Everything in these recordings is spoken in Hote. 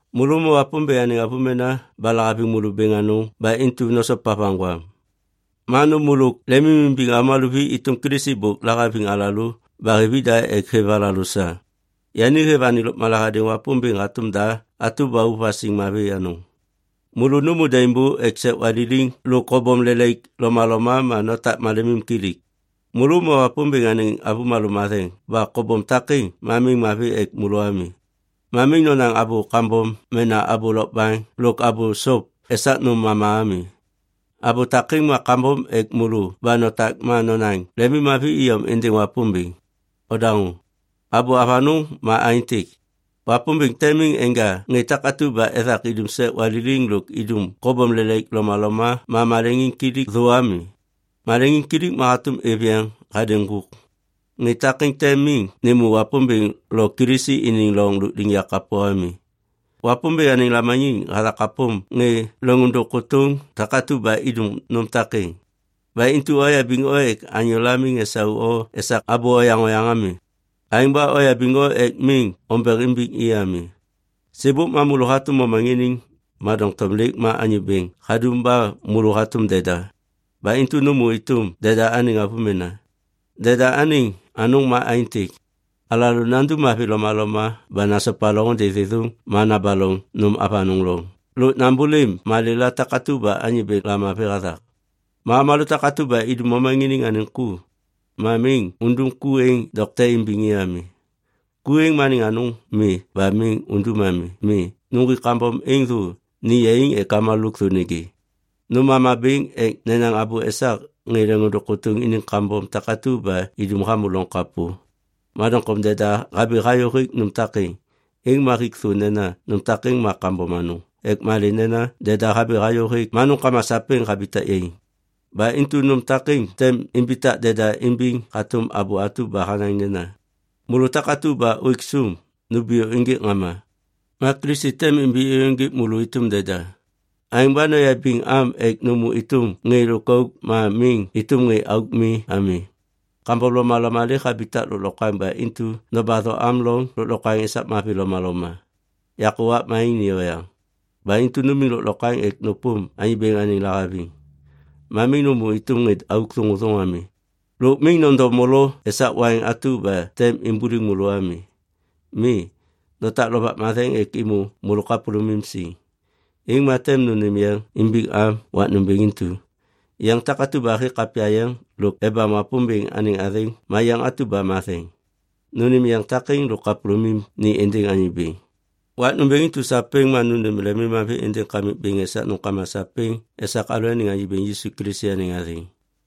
Môlô ma Wapômbêŋ anêŋ avômena ba lahaviŋ môlô bêŋ anôŋ ba intu nosopa vaŋgwam. Ma nômô lôk lemimimbiŋ avômalô vi êtôm Kilisi bôk lahaviŋ alalô ba hêv ida ek hêv alalô sa. Yani hêv anêŋ lôkmala hadêŋ Wapômbêŋ hatôm da atu ba ôv vasiŋ mavi anôŋ. Môlô nômô daimbô ek sek waliliŋ lôk kobom lelaik lomaloma ma notak malemimkilik. Môlô ma Wapômbêŋ anêŋ avômalô matheŋ ba kobom takêŋ ma miŋ mavi ek môlô ami. Ma miŋ nonaŋ abô kambom mena abô lokbaŋ lôk abô sop esak nôm mama ami. Abô takêŋ ma kambom ek môlô ba notak ma nonaŋ lemimmavi iyom êndêŋ Wapômbêŋ. Odaŋô, abô avanôŋ ma aêntêk. Wapômbêŋ tem miŋ enja ŋê takatu ba ethak idum sek waliliŋ lôk idum kobom lelaik lomaloma ma maleŋiŋkilik thô ami. Maleŋiŋkilik ma hatôm êv yeŋ hadêŋ ŋgôk. Ŋê takêŋ tem miŋ nêmô Wapômbêŋ lo Kilisi iniŋ loŋ lôkliŋyak kapô ami. Wapômbêŋ anêŋ lamaniŋ hathak hapôm ŋê leŋôndôŋ kôtôŋ takatu ba idum nôm takêŋ. Ba intu oyabiŋ o ek anyôla miŋ esau o esak abô oyaŋ oyaŋ ami. Aêŋ ba oyabiŋ o ek miŋ ombeŋ imbiŋ i ami. Sêbôk ma môlô hatôm momaŋiniŋ, ma doŋtom lêk ma Anyô Bêŋ hadum ba môlô hatôm deda. Ba intu nômô êtôm deda anêŋ avômena. Deda anêŋ anôŋ ma aêntêk. Alalô nandum mavi lomaloma ba nasopa loŋôndê thêthôŋ ma nabaloŋ nôm avanôŋ loŋ lôk nambôlêm malêla takatu ba Anyô Bêŋ lamavi hathak. Ma avômalô takatu ba idum momaŋiniŋ anêŋ ku, ma miŋ undum ku êŋ dokte imbiŋ i ami. Ku êŋ ma anêŋ anôŋ mi ba miŋ undum ami. Mi, nuŋgwik kambom êŋ thô ni yaiŋ ek avômalô lôkthô nêgê. Nôm mama bêŋ ek nenaŋ abô esak ŋê leŋôndôŋ kôtôŋ iniŋ kambom takatu ba idum hamô loŋ kapô. Ma doŋtom deda habi hayô hêk nôm takêŋ, êŋ ma hik thô nena nôm takêŋ ma kambom anôŋ ek malê nena deda habi hayô hêk ma nômkama sapêŋ habitak yaiŋ. Ba intu nôm takêŋ tem imbitak deda imbiŋ hatôm abô atu ba hanaŋ nena, “Môlô takatu ba ôêk sôm, numbiyô ênjêk ŋama. Ma Kilisi tem imbi êyôŋgêk môlô êtôm deda.” Aêŋ ba noyabiŋ am ek nômô êtôm ŋê lôkauk ma miŋ êtôm ŋê auk mi ami. Kambom lomaloma lêk habitak lôklokwaŋ ba intu nobatho am loŋ lôklokwaŋ esak mavi lomaloma. Yakô wakma êŋ ni oyaŋ. Ba intu numiŋ lôklokwaŋ ek nôpôm Anyô Bêŋ anêŋ lahaviŋ. Ma miŋ nômô êtôm ŋê auk thôŋôthôŋ ami. Lôk miŋ nondo molo esak waiŋ atu ba tem imbuliŋ môlô ami. Mi, notak Lovak Matheŋ ek êmô môlô kapôlômim siŋ. Êŋ ma tem nônêm yeŋ imbiŋam wak nômbêŋ intu, yeŋ takatu ba hêk kapya yeŋ lôk ebam Wapômbêŋ anêŋ athêŋ ma yeŋ atu ba matheŋ. Nônêm yeŋ takêŋ lôk kapôlômim ni êndêŋ Anyô Bêŋ. Wak nômbêŋ intu sapêŋ ma nônêm lemimmavi êndêŋ Kamik Wapômbêŋ esak nômkama sapêŋ esak alalôaniŋ Anyô Bêŋ Yisu Kilisi anêŋ athêŋ.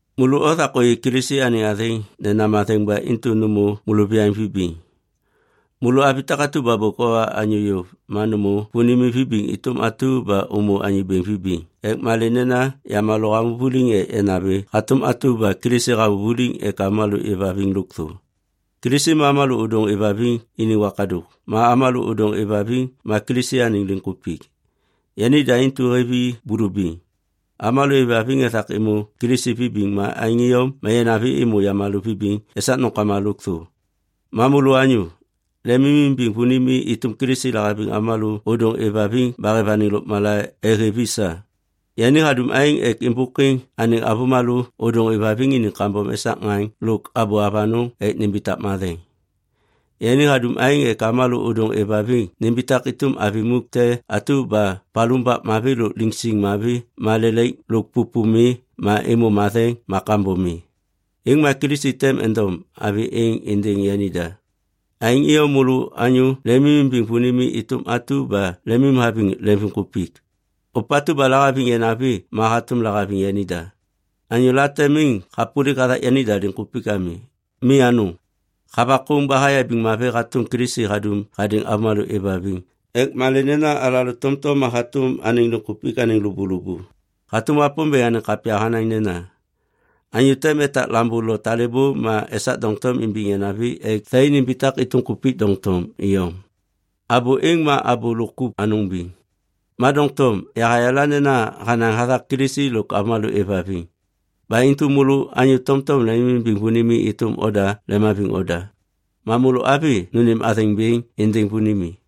Môlô othak ôyê Kilisi anêŋ athêŋ nena matheŋ ba intu nômô môlôviyaŋ vibiŋ. Môlô avi takatu ba bôk owa anyô yôv ma nômô vônimi vibiŋ êtôm atu ba ômô Anyô Bêŋ vibiŋ ek malê nena yamalô hamô vuliŋ ek yanavi hatôm atu ba Kilisi hamô vuliŋ ek avômalô êvhaviŋ lôkthô. Kilisi ma avômalô ôdôŋ êvhaviŋ iniŋ wakadôk ma avômalô ôdôŋ êvhaviŋ ma Kilisi anêŋ liŋkupik. Yanida intu hêv i bulubiŋ. Avômalô êvhaviŋ ethak êmô Kilisi vibiŋ ma aêŋ iyom ma yanavi êmô yamalô vibiŋ esak nômkama lôkthô. Ma môlô anyô, lemimimbiŋ vônimi êtôm Kilisi lahaviŋ avômalô ôdôŋ êvhaviŋ ba hêv anêŋ lôkmala ek hêv i sa. Yani hadum aêŋ ek êmbôkwiŋ anêŋ avômalô ôdôŋ êvhaviŋ iniŋ kambom esak ŋaŋ lôk abô avanôŋ ek nimbitak matheŋ. Yani hadum aêŋ ek avômalô ôdôŋ êvhaviŋ nimbitak êtôm avi muk te atu ba palumbak mavi lôk liŋsiŋ mavi ma lelaik lo pôpô mi ma êmô matheŋ ma kambom mi. Êŋ ma Kilisi tem endom avi êŋ êndêŋ yanida. Aêŋ iyom môlô anyô lemimbiŋ vônimi êtôm atu ba lemimhaviŋ lemvimkupik. Ôpatu ba lahaviŋ yanavi ma hatôm lahaviŋ yanida. Anyô late miŋ hapôlik hathak yanida liŋkupik ami. Mi anôŋ, havakôŋ ba hayabiŋ mavi hatôm Kilisi hadum hadêŋ avômalô êvhaviŋ ek malê nena alalô tomtom ma hatôm anêŋ liŋkupik anêŋ lôbôlôbô. Hatôm Wapômbêŋ anêŋ kapya hanaŋ nena, “Anyô tem etak lambô lo talêbô ma esak doŋtom imbiŋ yanavi ek thai nimbitak êtôm kupik doŋtom iyom.” Abô êŋ ma abô lôk kup anôŋ biŋ. Ma doŋtom yahayala nena hanaŋ hathak Kilisi lôk avômalô êvhaviŋ. Ba intu môlô anyô tomtom lemimbiŋ vônimi êtôm oda lemhaviŋ oda. Ma môlô avi nônêm athêŋ bêŋ êndêŋ vônimi.